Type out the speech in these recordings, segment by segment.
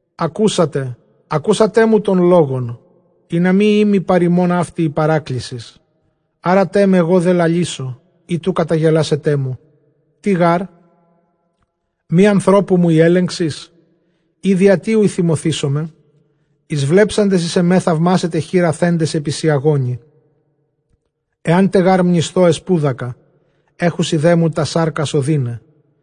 Ἀκούσατε ἀκούσατέ μου τῶν λόγων, ἵνα μὴ ᾖ μοι παρʼ ὑμῶν αὕτη ἡ παράκλησις. Ἄρατέ με, ἐγὼ δὲ λαλήσω, εἶτʼ οὐ καταγελάσετέ μου. Τί γάρ; μὴ ἀνθρώπου μου ἡ ἔλεγξις; ἢ διὰ τί οὐ θυμωθήσομαι; Εἰσβλέψαντες εἰς ἐμὲ θαυμάσετε, χεῖρα θέντες ἐπὶ σιαγόνι. Ἐάν τε γὰρ μνησθῶ, ἐσπούδακα· ἔχουσι δέ μου τὰς σάρκας ὀδύναι.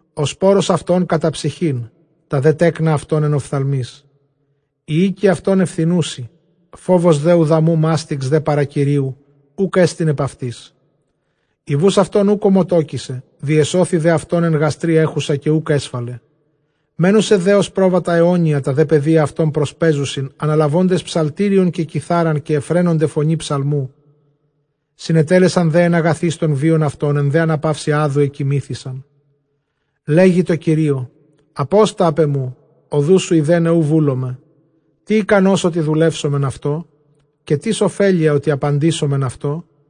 Ὁ σπόρος αὐτῶν κατὰ ψυχὴν, τὰ δὲ τέκνα αὐτῶν ἐν ὀφθαλμοῖς. Οἱ οἶκοι αὐτῶν εὐθηνοῦσι, φόβος δὲ οὐδαμοῦ, μάστιξ δὲ παρὰ Κυρίου οὐκ ἔστιν ἐπʼ αὐτοῖς. Ἡ βοῦς αὐτῶν οὐκ ὠμοτόκησε, διεσώθη δὲ αὐτῶν ἐν γαστρὶ ἔχουσα καὶ οὐκ ἔσφαλε. Μένουσι δὲ ὡς πρόβατα αἰώνια, τὰ δὲ παιδία αὐτῶν προσπαίζουσιν, ἀναλαβόντες ψαλτήριον καὶ κιθάραν, καὶ εὐφραίνονται φωνῇ ψαλμοῦ. Συνετέλεσαν δὲ ἐν ἀγαθοῖς τὸν βίον αὐτῶν, ἐν δὲ ἀναπαύσει ᾅδου ἐκοιμήθησαν. Λέγει δὲ Κυρίῳ, ἀπόστα ἀπʼ ἐμοῦ, ὁδούς σου εἰδέναι οὐ βούλομαι. Τί ἱκανὸς, ὅτι δουλεύσομεν αὐτῷ; καὶ τίς ὠφέλεια, ὅτι ἀπαντήσομεν αὐτῷ;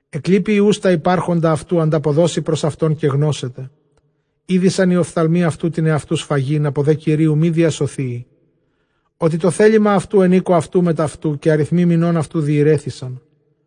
Ἐκλείποι υἱοὺς τὰ ὑπάρχοντα αὐτοῦ, ἀνταποδώσει πρὸς αὐτὸν καὶ γνώσεται. Ἴδοισαν οἱ ὀφθαλμοὶ αὐτοῦ τὴν ἑαυτοῦ σφαγὴν, ἀπὸ δὲ Κυρίου μὴ διασωθείη. Ὅτι τὸ θέλημα αὐτοῦ ἐν οἴκῳ αὐτοῦ μετʼ αὐτοῦ, καὶ ἀριθμοὶ μηνῶν αὐτοῦ διῃρέθησαν.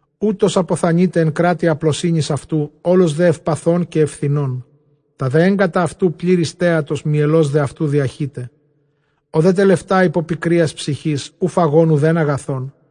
Οὗτος ἀποθανεῖται ἐν κράτει ἁπλοσύνης αὐτοῦ, ὅλος δὲ εὐπαθῶν καὶ εὐθηνῶν. Τὰ δὲ ἔγκατα αὐτοὺ πλήρη στέατος, μυελὸς δὲ αὐτοῦ διαχεῖται. Ὁ δὲ τελευτᾷ ὑπὸ πικρίας ψυχῆς, οὐ φαγὼν οὐδὲν ἀγαθόν.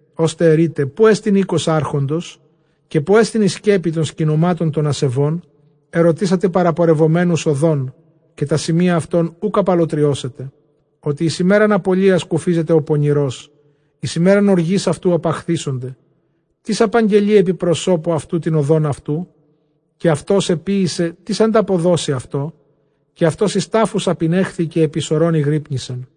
Ὥστε ἐρεῖτε, ποῦ ἐστιν οἶκος ἄρχοντος; καὶ ποῦ ἐστιν ἡ σκέπη τῶν σκηνωμάτων τῶν ἀσεβῶν; Ἐρωτήσατε παραπορευομένους ὁδὸν, καὶ τὰ σημεῖα αὐτῶν οὐκ ἀπαλλοτριώσετε. Ὅτι εἰς ἡμέραν ἀπωλείας κουφίζεται ὁ πονηρὸς, εἰς ἡμέραν ὀργῆς αὐτοῦ ἀπαχθήσονται. Τίς ἀπαγγελεῖ ἐπὶ προσώπου αὐτοῦ τὴν ὁδὸν αὐτοῦ, καὶ αὐτὸς ἐποίησε; τίς ἀνταποδώσει αὐτῷ; Καὶ αὐτὸς εἰς τάφους ἀπηνέχθη, καὶ αὐτὸς ἐπὶ σωρῶν ἠγρύπνησεν.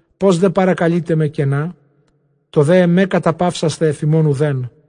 Πῶς δὲ παρακαλεῖτέ με κενά; τὸ δὲ ἐμὲ καταπαύσασθαι ἀφʼ ὑμῶν οὐδέν.